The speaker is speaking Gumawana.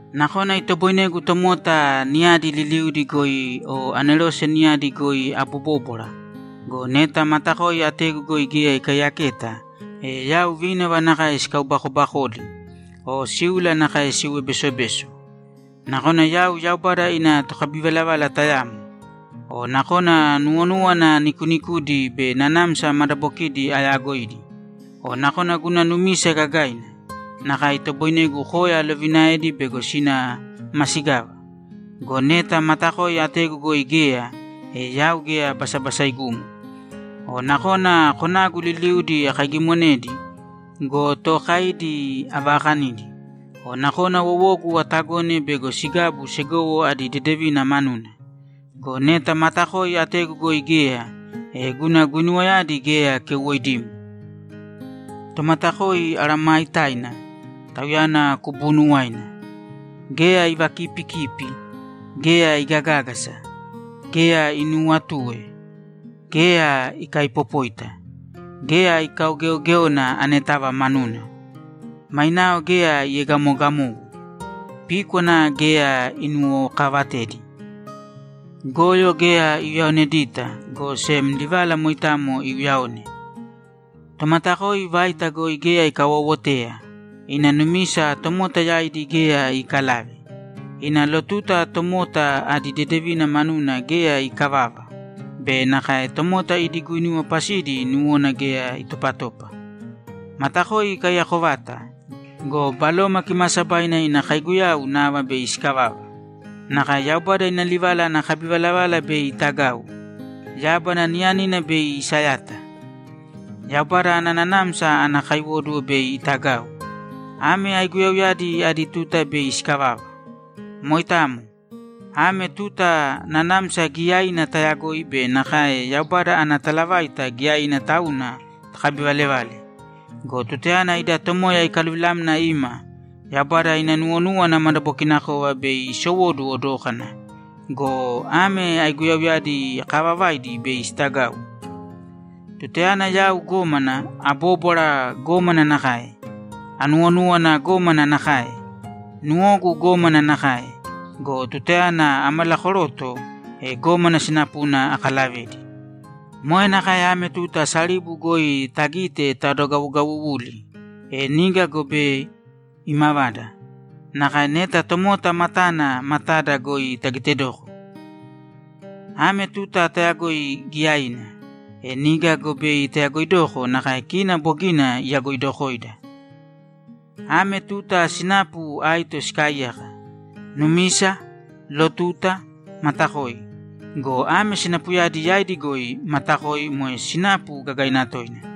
Nakona itoboinegu tomota niyadi liliudi goi o anerose niyadi goi abobóbwara go, neta matakoi ategu goi geya ikaiyaketa, e yau vínava nakae sikaubakobakoli o síula nakae siuwe besobeso. Nakona yau Yaubada ina tokabivalavala tayamo. O nakona nuwonúwana nikuunikudi be nanamsa madabokidi ayagoidi. O nakona guna numisa gagaina, nakae itoboinegu koya alovinaedi bego sina masigava. Go neta matakoi ategu goi geya, e yau geya basabasaigumo. O nakona konagu liliuudi akaigimonedi go, tookaidi avakanidi. O nakona wowogu atagone bego sigabu segowo adi dedevina manuna. Go neta matakoi ategu goi geya, e guna guinuwayadi geya keuwoidimo. Tomatakoi araamaitaina, tauyana kubuunuwaina. Geya ivakiipikipi; geya igagágasa; geya inuuwatue; geya ikaaipopóita; geya ikaugeogéona anetava manuna; mainao geya iegamoogamogu; píkwana geya inuwokaavatedi. Goyo geya iuyaonedita, go sem livala moitamo iuyaone. Tomatakoi vaita goi geya ikawoowoteya, ina numisa tomota yaidi geya iikalave, ina lotuta tomota adi dedevina manuna geya iikavava, be nakae tomota idi guinuwa pasidi nuwona geya itopatopa. Matakoi ikaiyako vata go, Baloma Kimaasabaina ina kaiguyau nava bei sikavava. Nakae Yaubada ina livala ana kabivalavala bei itagau. Yábana niyanina bei isayata. Yaubada ana nanamsa ana kaiwóduwo bei itagau. Ame aiguyauyadi adi tuta bei sikavava. Moitamo. Ame tuta nanamsa giyaina tayagoi be nakae Yaubada ana talavaita giyaina tauna takabivalevale. Go tutayana ida Tomoya ikaluvilamna ima, Yaubada ina nuwonúwana madabokinakova bei isowoduwo dókana go, ame aiguyauyadi kaavavaidi bei sitagau. Tutayana yau gómana, abóbwara gómana nakae, anuwonúwana gómana nakae, nuwogu gómana nakae go, tutayana amalakoroto, e gómana sinapuna akalavedi. Moe nakae ame tuta saribu goi tagite tadogawugawuwuli. E niga go bei imavada nakae neta tomota matana matada goi tagitedoko. Ame tuta tayagoi giyaina. E niga go bei tayagoidoko nakae kina bogina iyagoidokoida. E ame tuta sinapu aito sikaaiyaka: Numisa, lotuta, matakoi. Go ame sinapuyadi yaidi goi matakoi moe sinapu gagaina toina.